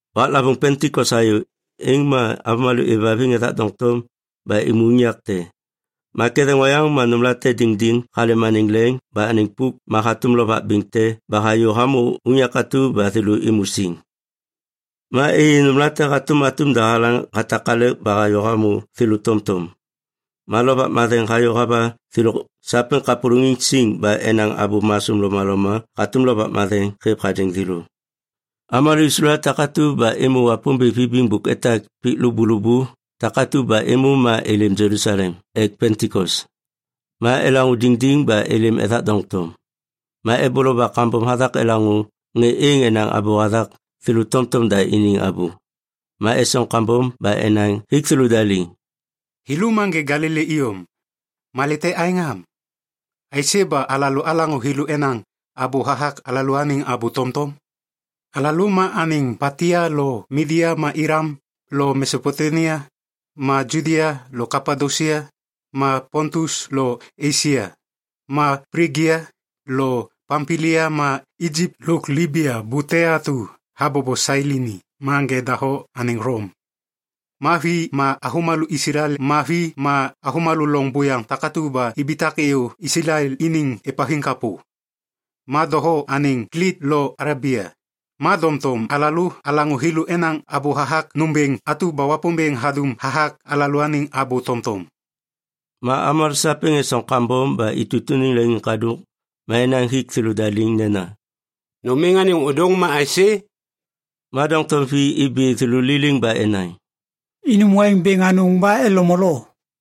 Waklavôŋ Pentikos hayô, êŋ ma avômalô êvhaviŋ ethak doŋtom ba êmô unyak te. Ma ketheŋ oyaŋ ma nômlate diŋdiŋ halêm anêŋ leŋ ba anêŋ pôk ma hatôm lovak bêŋ te ba hayô hamô unyak atu ba thêlô êmô siŋ. Ma êyê nômlate hatôm atum dahalaŋ hatakalek ba hayô hamô thêlô tomtom. Ma Lovak Matheŋ hayô hava thêlô sapêŋ kapôlôŋiŋ siŋ ba enaŋ abô masôm lomaloma hatôm Lovak Matheŋ hêv hadêŋ thêlô. Avômalô Islael takatu ba êmô Wapômbêŋ vibiŋ bôk etak pik lôbôlôbô takatu ba êmô ma êlêm Jelusalem ek Pentikos. Ma elaŋô diŋdiŋ ba êlêm ethak doŋtom. Ma eboloba kambom hathak elaŋô ŋê êŋ enaŋ abô hathak thêlô tomtom da iniŋ abô. Ma esoŋ kambom ba enaŋ hik thêlôda liŋ, “Thêlô ma ŋê Galili iyom. Malê te aêŋ am? Aisê ba alalô alaŋô thêlô enaŋ abô hathak alalôaniŋ abô tomtom? Alalô ma anêŋ Patia lo Midia ma Ilam lo Mesopotemia ma Judia lo Kapadosia ma Pontus lo Esia ma Plijia lo Pampilia ma Ijip lôk Libia bute atu habobo Sailini ma ŋê doho anêŋ Lom. (Ma vi ma avômalô Islael, ma vi ma avômalô loŋ buyaŋ takatu ba ibitak êyô Islael iniŋ êvhaviŋ kapô.) Ma doho anêŋ Klit lo Alebia. Ma doŋtom alalô alaŋô thêlô enaŋ abô hathak nômbêŋ atu ba Wapômbêŋ hadum hathak alalôaniŋ abô tomtom.” Ma avômalô sapêŋ esoŋ kambom ba itutuniŋ leŋiŋkadôk ma enaŋ hik thêlôda liŋ nena, “Nôm êŋ anêŋ ôdôŋ ma aisê?” Ma doŋtom vi ibi thêlô liliŋ ba enaŋ, “Inum waiŋ bêŋ anôŋ ba elo molo.”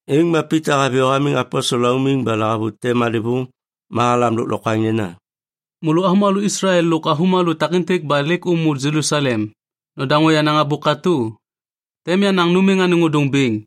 Êŋ ma Pita haviyô hamiŋ aposel laumiŋ ba lahavute malêvôŋ ma halam lôklokwaŋ nena, “Môlô avômalô Islael lôk avômalô takêntêk ba lêk ômô Jelusalem, nodaŋô yenaŋ abô katô. Tem yanaŋ nôm êŋ anêŋ ôdôŋ bêŋ.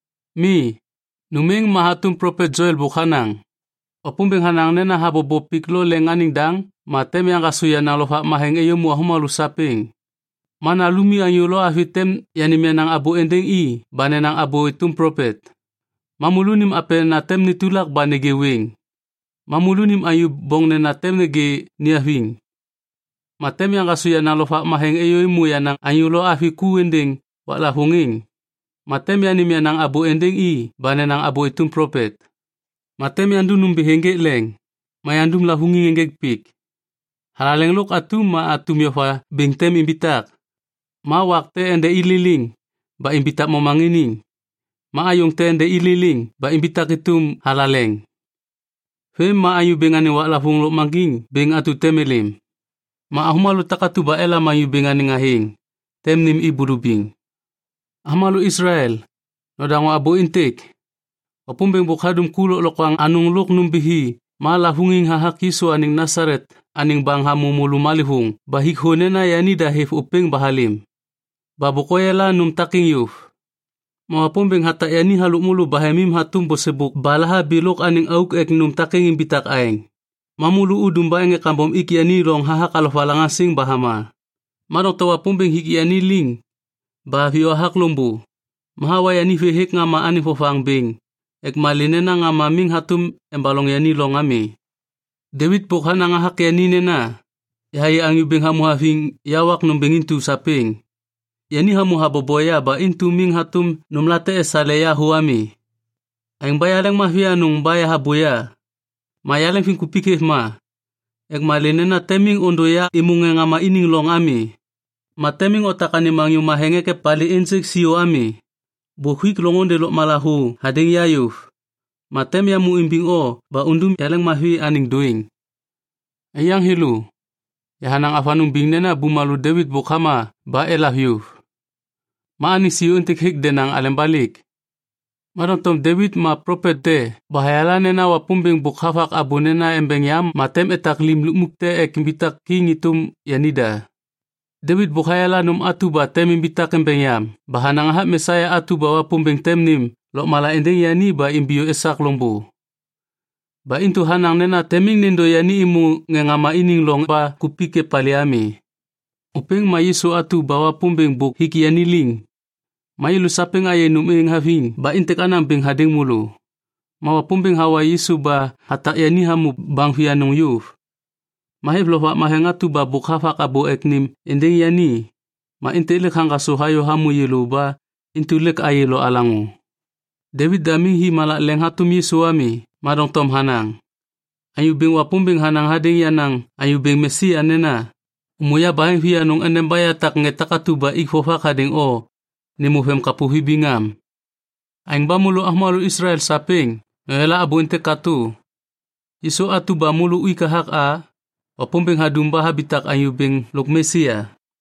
Mi, nôm êŋ ma hatôm plopet Joel bôk hanaŋ, “‘Wapômbêŋ hanaŋ nena habobo pik lo leŋ anêŋ daŋ ma tem yaŋgasô yenaŋ Lovak Matheŋ êyômô avômalô sapêŋ. Ma nalumi anyô lo avi tem yanêm yenaŋ abô êndêŋ i ba nenaŋ abô êtôm plopet. Ma môlônim apenena tem netulak ba nêgê wêŋ. Ma môlônim anyô boŋnena tem nêgê niaviŋ. Ma tem yaŋgasô yenaŋ Lovak Matheŋ êyômô yenaŋ anyô lo avi ku êndêŋ waklavôŋ êŋ ma tem yanêm yenaŋ abô êndêŋ i ba nenaŋ abô êtôm plopet. Ma tem yandum nômbithi ênjêk leŋ, ma yandum lavôŋiŋ ênjêk pik. Thalaleŋ lôk atum ma atum yova bêŋ tem imbitak. Ma wak tem ende i liliŋ ba imbitak momaŋiniŋ, ma ayôŋ tem ende i liliŋ ba imbitak êtôm thalaleŋ. Vêm ma Anyô Bêŋ anêŋ waklavôŋ lôkmaŋgiŋ bêŋ atu tem êlêm. Ma avômalô takatu ba elam Anyô Bêŋ anêŋ athêŋ, tem nêm i bulubiŋ.’ “Avômalô Islael, nodaŋô abô êntêk. Wapômbêŋ bôk hadum ku lôklokwaŋ anôŋ lôk nômbithi ma lavôŋiŋ hathak Yisu anêŋ Nasalet anêŋ baŋ hamô môlô malêvôŋ ba hik thô nena yanida hêv ôpêŋ ba halêm. Ba bôk oyala nôm takêŋ yôv. Ma Wapômbêŋ hatak yani halôk môlô bahemim hatôm bôsêbôk ba lahabi lôk anêŋ auk ek nôm takêŋ imbitak aêŋ. Ma môlô udum ba ŋê kambom ik yani loŋ hathak alovalaŋaŋsiŋ ba hama. Ma doŋtom Wapômbêŋ hik yani liŋ ba haviyô hathak loŋbô ba hawa yani vê hêk ŋama anêŋ vovaŋ bêŋ ek malê nena ŋama miŋ hatôm embaloŋ yani loŋ ami. Devit bôk hanaŋ hathak yani nena, “‘Yahayê Anyô Bêŋ hamô haviŋ ya wak nômbêŋ intu sapêŋ. Yani hamô habobo ya ba intu miŋ hatôm nômlate esale ya thô ami. Aêŋ ba yaleŋmavi anôŋ ba yahabôya. Ma yaleŋviŋkupik hêv ma. Ek malê nena tem miŋ ôndô ya êmô ŋê ŋama iniŋ loŋ ami, ma tem miŋ otak anêm Anyô Matheŋ ek epalê ênjêk siô ami. Bôk huik loŋôndê lôkmala thô hadêŋ ya yôv, ma tem yamô imbiŋ o ba undum yaleŋmavi anêŋ dôêŋ.’ “Aiyaŋ thêlô, yahanaŋ avanôŋ biŋ nena bumalô Devit bôk hama ba elav yôv. Ma anêŋ siô êntêk hêk denaŋ aleba lêk. Ma doŋtom Devit ma plopet te ba hayala nena Wapômbêŋ bôk havak abô nena embeŋ yam ma tem etak lim lukmuk te ek imbitak kiŋ êtôm yanida. Devit bôk hayala nôm atu ba tem imbitak embeŋ yam ba hanaŋ hathak Mesia atu ba Wapômbêŋ tem nêm lôkmala êndêŋ yani ba imbiyô esak loŋbô. Ba intu hanaŋ nena tem miŋ nêndô yani êmô ŋê ŋama iniŋ loŋ ba kupik epalê ami. Ôpêŋ ma Yisu atu ba Wapômbêŋ bôk hik yani liŋ. Ma yêlô sapêŋ ayê nôm êŋ haviŋ ba êntêk anaŋ bêŋ hadêŋ môlô. Ma Wapômbêŋ hawa Yisu ba hatak yani hamô baŋ vianôŋ yôv. Ma hêv Lovak Matheŋ atu ba bôk havak abô ek nêm êndêŋ yani ma êntêk lêk haŋgasô hayô hamô yêlô ba intu lêk ôyê lo olaŋô. Devit da miŋ hi malak leŋ hatôm Yisu ami, ma doŋtom hanaŋ, “‘Anyô Bêŋ Wapômbêŋ hanaŋ hadêŋ yenaŋ Anyô Bêŋ Mesia nena, “Ômô yabaheŋ vianôŋ endeba yatak ŋê takatu ba ik vovak hadêŋ o nêmô vemkapô vibiŋ am.” ’ “Aêŋ ba môlô avômalô Islael sapêŋ, noyala abô êntêk katô. Yisu atu ba môlô uik hathak a, Wapômbêŋ hadum ba habitak Anyô Bêŋ lôk Mesia.”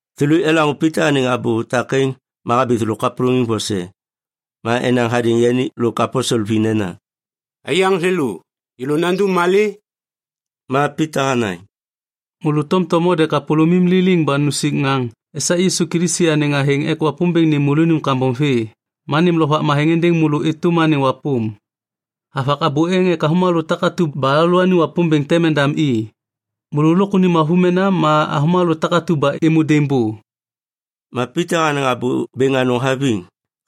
Thêlô elaŋô Pita anêŋ abô takêŋ ma habi thêlô kapôlôŋiŋ vose. Ma enaŋ hadêŋ yani lôk aposel vi nena, “Aiyaŋ thêlô, yêlô nandum malê?” Ma Pita hanaŋ, “Môlô tomtom node kapôlômim liliŋ ba nusik ŋaŋ esak Yisu Kilisi anêŋ athêŋ ek Wapômbêŋ nêm môlônim kambom vê ma nêm Lovak Matheŋ êndêŋ môlô êtôm anêŋ wapôm. Havak abô êŋ ek avômalô takatu ba alalôaniŋ Wapômbêŋ tem endam i, môlô lôk unim avômena ma avômalô takatu ba êmô daimbô.” Ma Pita hanaŋ abô bêŋ anôŋ haviŋ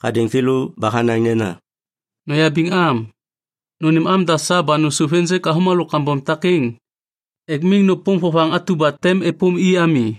hadêŋ thêlô ba hanaŋ nena, “Noyabiŋ am. Nônêm amda sa ba nôsôv ênjêk avômalô kambom takêŋ ek miŋ nôpôm vovaŋ atu ba tem êpôm i ami.”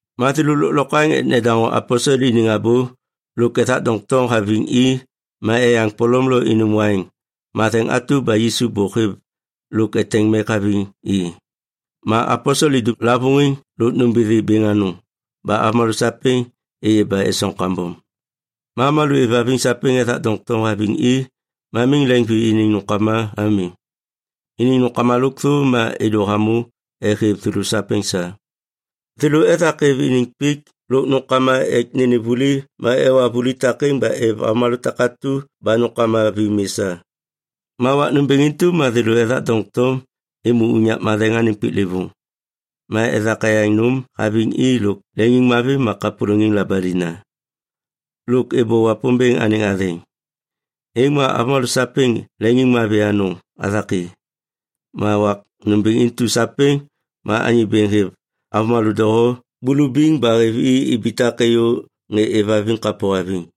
Ma thêlô lôklokwaŋ ek nedaŋô aposel iniŋ abô lôk ethak doŋtom haviŋ i ma eyaŋ polom lo inum waiŋ matheŋ atu ba Yisu bôk hêv lôk eteŋ mek haviŋ i. Ma aposel idum lavôŋiŋ lôk nômbithi bêŋ anôŋ ba avômalô sapêŋ êyê ba esoŋ kambom. Ma avômalô êvhaviŋ sapêŋ ethak doŋtom haviŋ i ma miŋ leŋvi iniŋ nômkama ami. Iniŋ nômkama lôkthô ma êdô hamô ek hêv thêlô sapêŋ sa. Thêlô ethak êv iniŋ pik lôk nômkama ek nênêm vuli ma ewa vuli takêŋ ba êv avômalô takatu ba nômkama vi mi sa. Ma wak nômbêŋ intu ma thêlô ethak doŋtom êmô unyak matheŋ anêŋ piklêvôŋ. Ma ethak eyaŋ nôm haviŋ i lôk leŋiŋmavi ma kapôlôŋiŋ labalina. Lôk êbô Wapômbêŋ anêŋ athêŋ. Êŋ ma avômalô sapêŋ leŋiŋmavi anôŋ hathak i. Ma wak nômbêŋ intu sapêŋ ma Anyô Bêŋ hêv avômalô doho bulubiŋ ba hêv i ibitak êyô ŋê êvhaviŋ kapô haviŋ.